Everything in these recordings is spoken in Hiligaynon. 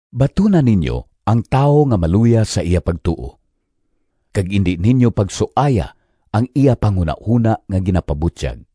Batuna ninyo ang tawo nga maluya sa iya pagtuo, kag indi ninyo pagsuaya ang iya panghunahona nga ginapabutyag.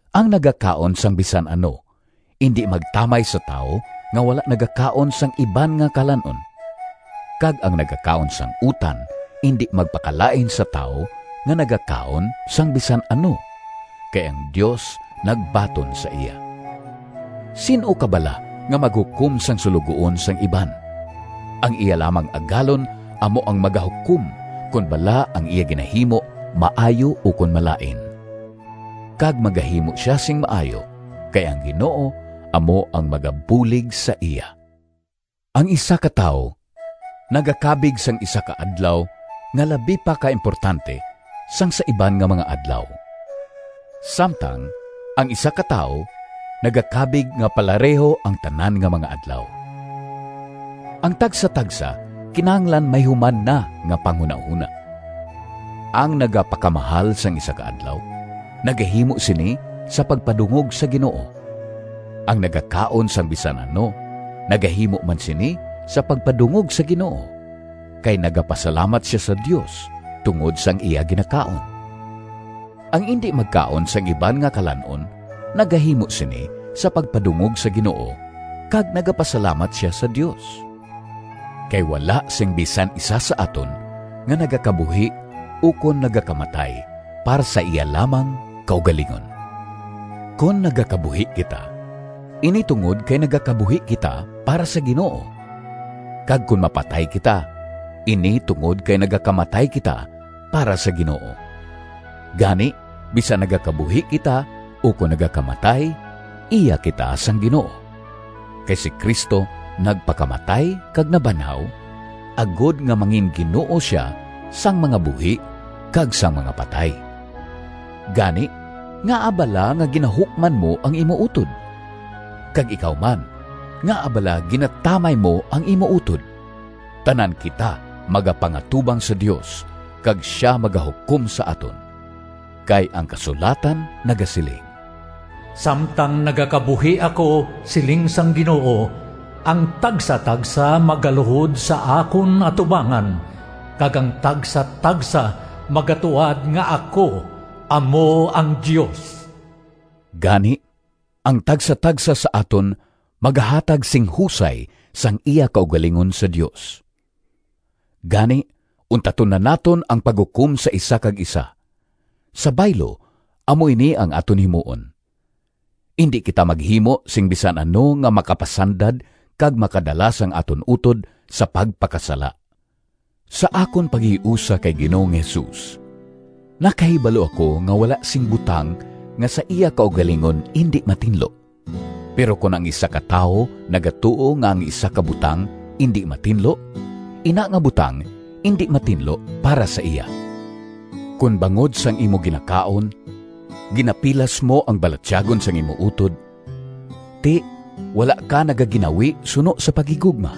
Ang nagakaon sang bisan ano indi magtamay sa tawo nga wala nagakaon sang iban nga kalan-on. Kag ang nagakaon sang utan, indi magpakalain sa tawo nga nagakaon sang bisan ano, kay ang Dios nagbaton sa iya. Sin-o ka bala nga maghukom sang suloguon sang iban? Ang iya lamang Agalon amo ang magahukom kon bala ang iya ginahimo maayo ukon malain. Kag magahimo sia sing maayo, kay ang Ginoo amo ang magabulig sa iya. Ang isa ka tawo nagakabig sang isa ka adlaw nga labi pa ka importante sang sa iban nga mga adlaw. Samtang ang isa ka tawo nagakabig nga palareho ang tanan nga mga adlaw. Ang tagsatagsa kinahanglan may human na nga panghunahona. Ang nagapakamahal sang isa ka adlaw nagahimo sini sa pagpadungog sa Ginoo. Ang nagakaon sang bisan ano nagahimo man sini sa pagpadungog sa Ginoo, kay nagapasalamat sia sa Dios tungod sang iya ginakaon. Ang indi magkaon sang iban nga kalan-on nagahimo sini sa pagpadungog sa Ginoo, kag nagapasalamat sia sa Dios. Kay wala sing bisan isa sa aton nga nagakabuhi ukon nagakamatay para sa iya lamang kaugalingon. Kon nagakabuhi kita, ini tungod kay nagakabuhi kita para sa Ginoo. Kag kon mapatay kita, ini tungod kay nagakamatay kita para sa Ginoo. Gani, bisan nagakabuhi kita ukon nagakamatay, iya kita sang Ginoo. Kay si Cristo nagpakamatay kag nabanhaw, agod nga mangin-Ginoo sia sang mga buhi kag sang mga patay. Gani, ngaa bala nga ginahukman mo ang imo utod? Kag ikaw man, ngaa bala ginatamay mo ang imo utod? Tanan kita magapangatubang sa Dios kag sia magahukom sa aton. Kay ang kasulatan nagasiling: “Samtang nagakabuhi ako, Siling sang Ginoo, Ang tagsatagsa Magaluhod sa akon atubangan, Kag ang tagsatagsa Magatuad nga ako amo ang Dios.” Gani, ang tagsatagsa sa aton magahatag sing husay sang iya kaugalingon sa Dios. Gani, untaton na naton ang paghukom sa isa kag isa. Sa baylo, amo ini ang aton himuon: indi kita maghimo sing bisan ano nga makapasandad kag makadala sang aton utod sa pagpakasala. Sa akon paghiusa kay Ginoong Jesus nakahibalo ako nga wala sing butang nga sa iya kaugalingon indi matinlo. Pero kon ang isa ka tawo nagatuo nga ang isa ka butang indi matinlo, ina nga butang indi matinlo para sa iya. Kon bangod sang imo ginakaon, ginapilas mo ang balatyagon sang imo utod, ti wala ka nagaginawi suno sa paghigugma.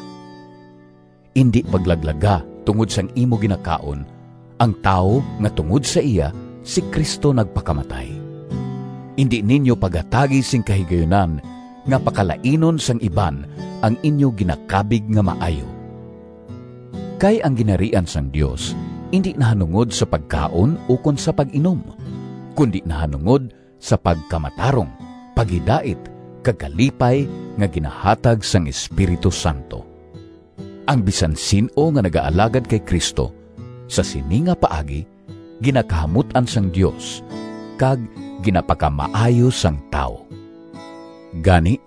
Indi paglaglaga, tungod sang imo ginakaon, ang tawo nga tungod sa iya si Cristo nagpakamatay! Indi ninyo paghatagi sing kahigayunan nga pakalainon sang iban ang inyo ginakabig nga maayo. Kay ang Ginharian sang Dios indi nahanungod sa pagkaon ukon sa pag-inom, kundi nahanungod sa pagkamatarong, paghidait kag kalipay nga ginahatag sang Espiritu Santo. Ang bisan sin-o nga nagaalagad kay Cristo sa sini nga paagi, ginakahamut-an sang Dios kag ginapakamaayo sang tawo. Gani,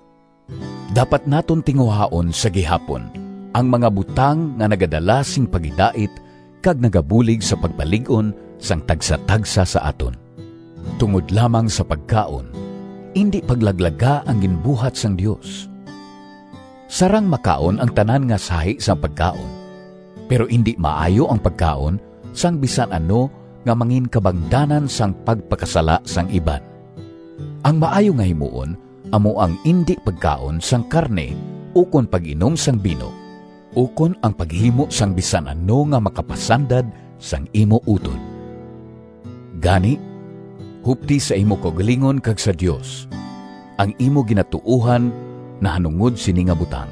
dapat naton tinguhaon sa gihapon ang mga butang nga nagadala sing paghidait kag nagabulig sa pagpalig-on sang tagsatagsa sa aton. Tungod lamang sa pagkaon, indi paglaglaga ang ginbuhat sang Dios. Sarang makaon ang tanan nga sahi sang pagkaon, pero indi maayo ang pagkaon sang bisan ano nga manginkabangdanan sang pagpakasala sang iban. Ang maayo nga himuon amo ang indi pagkaon sang karne ukon pag-inom sing bino, ukon ang paghimo sang bisan ano nga makapasandad sang imo utod. Gani, hupti sa imo kaugalingon kag sa Dios, ang imo ginatuohan nahanungod sini nga butang.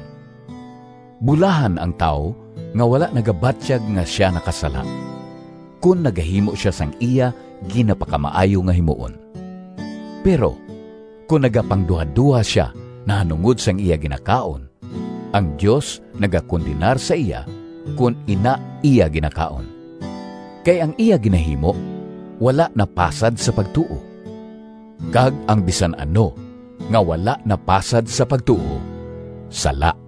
Bulahan ang tawo nga wala nagabatyag nga sia nakasala, kon nagahimo sia sang iya ginapakamaayo nga himuon! Pero kon nagapangduhadoha sia nahanungod sang iya ginakaon, ang Dios nagakondenar sa iya kon ina iya ginakaon, kay ang iya ginahimo wala napasad sa pagtuo. Kag ang bisan ano nga wala napasad sa pagtuo sala.